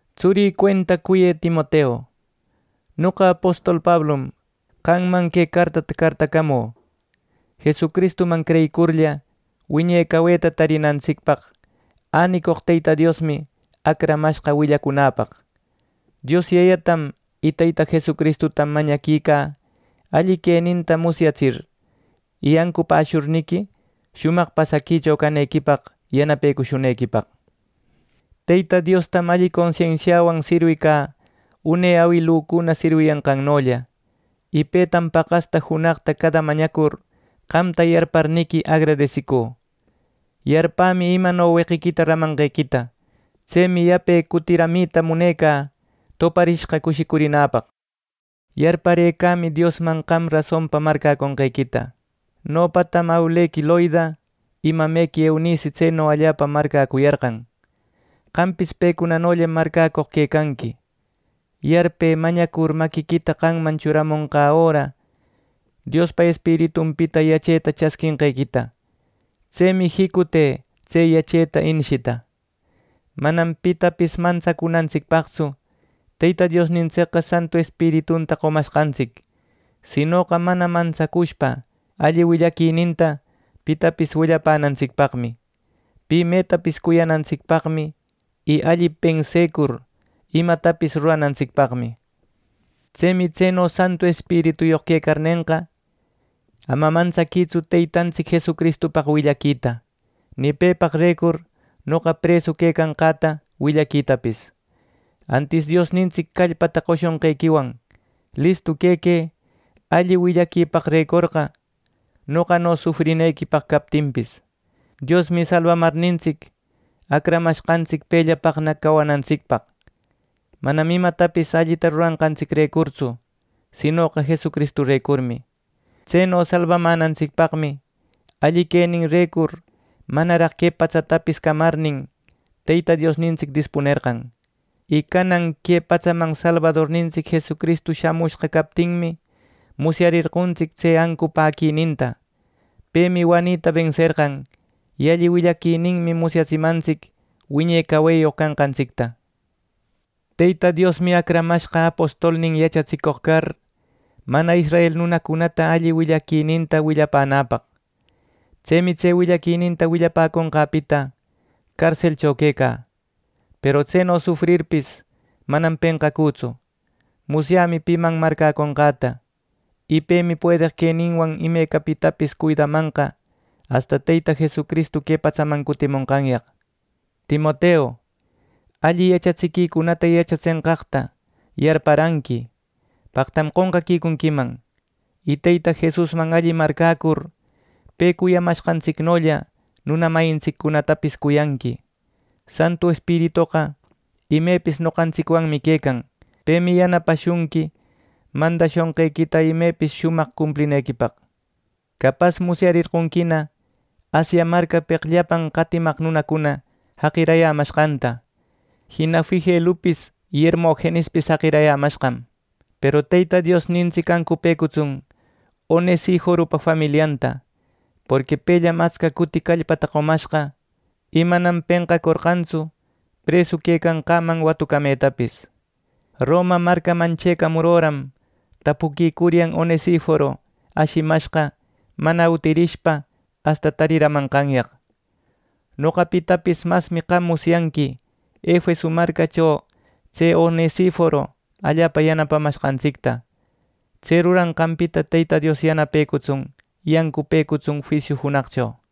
Tsurï cuenta, cuyë Timoteu, noqa apostol Pablum, qamman que cartata cartacamü. Jesucristuman creyicurlla, wiñe caweta tarinantsicpaq änicoq Teyta Diosmi acramashqa willacunäpaq. Dios Yayatam y Teyta Jesucristutam mañaquicä alli queninta musyatsir, y ancupäshurniqui, shumaq pasaquicho canequipaq yanapecushunequipaq. Teyta Diostam alli consensiawan sirwicä une awilücuna sirwiyanqannolla; y petam paqasta junaqta cada mañacur, qamta yarparniqui agradesicü. Yarpämi imano weqiquita ramanqequita. Tsemi yape cutiramita munecä toparishqa cushicurinäpaq. Yarparëcämi Diosman qam rasonpa marcäqonqequita. Nopatam awilequi Loida y mamequi Eunice tseno allapa marcäcuyarqan. Qampis pecunanollam marcäcoq quecanqui. Yarpë mañacur maquïta qamman churamonqa öra, Diospa Espiritunpita yacheta chasquinqequita. Tsemi jicute tse yacheta inishita. Manam pitapis mantsacunantsicpaqtsu Teyta Diosnintsicqa Santu Espiritunta qomashqantsic; sinoqa mana mantsacushpa alli willaquininta pitapis willapänantsicpaqmi, pi metapis cuyanantsicpaqmi, y alli pensecur imatapis ruranantsicpaqmi. Tsemi tseno Santu Espirituyoq quecarnenqa, ama mantsaquïtsu Teytantsic Jesucristupaq willaquita, ni pepaqrecur noqa presu quecanqäta willaquitapis. Antis Diosnintsic callpata qoshonqequiwan listu quequë alli willaquipaqrecorqa, noqano sufrinequipaq captinpis. Diosmi salbamarnintsic, acramashqantsic pellapaqna cawanantsicpaq, manam imatapis allita ruranqantsicrecurtsu sinoqa Jesucristurecurmi. Tseno salbamänantsicpaqmi alli queninrecur manaraq que patsatapis camarnin, Teyta Diosnintsic dispunerqan. Y canan que patsaman Salbadornintsic Jesucristu shamushqa captinmi, musyarerqontsic tse ancupäquininta. Pemi wanita benserqan, y alli willaquininmi musyatsimantsic wiñe caweyoq canqantsicta. Teyta Diosmi acramashqa apostolnin yachatsicoq car, ˻mana israel˼ nunacunata alli willaquininta willapänäpaq. Tsemi tse willaquininta willapäconqäpita carselcho quecä, peru tseno sufrirpis, manam penqacütsu. Musyämi piman marcäconqäta, y pemi puedeq queninwan imecapitapis cuidamanqa asta Teyta Jesucristu que patsaman cutimonqanyaq. Timoteu, alli yachatsiquicunata yachatsenqaqta yarparanqui, paqtam qonqecunquiman. Y Teyta Jesusman alli marcäcur, pe cuyamanqantsicnolla nuna mayintsiccunatapis cuyanqui. Santu Espiritoqa imepis noqantsicwanmi quecan. Pemi yanapashunqui mandashunqequita imepis shumaq cumplinequipaq. Capas musyarerqonquina Asia marcapeq llapan qatimaq nunacuna jaqirayämashqanta, jina Figelupis y Hermogenispis jaqirayämashqam. Peru Teyta Diosnintsic ancupëcutsun Onesiforopa familianta, porqui pellam atsca cuti callpata qomashqa, y manam penqacorqantsu presu quecanqaman watucametapis. Roma marcaman chëcamur öram tapuquicuryan Onesiforo ashimashqa mana utirishpa asta tariramanqanyaq. Noqapitapis masmi qam musyanqui Efeso marcacho tse Onesiforo allapa yanapamanqantsicta. Tse ruranqanpita Teyta Dios yanapecutsun y ancupëcutsun juisiu junaqcho.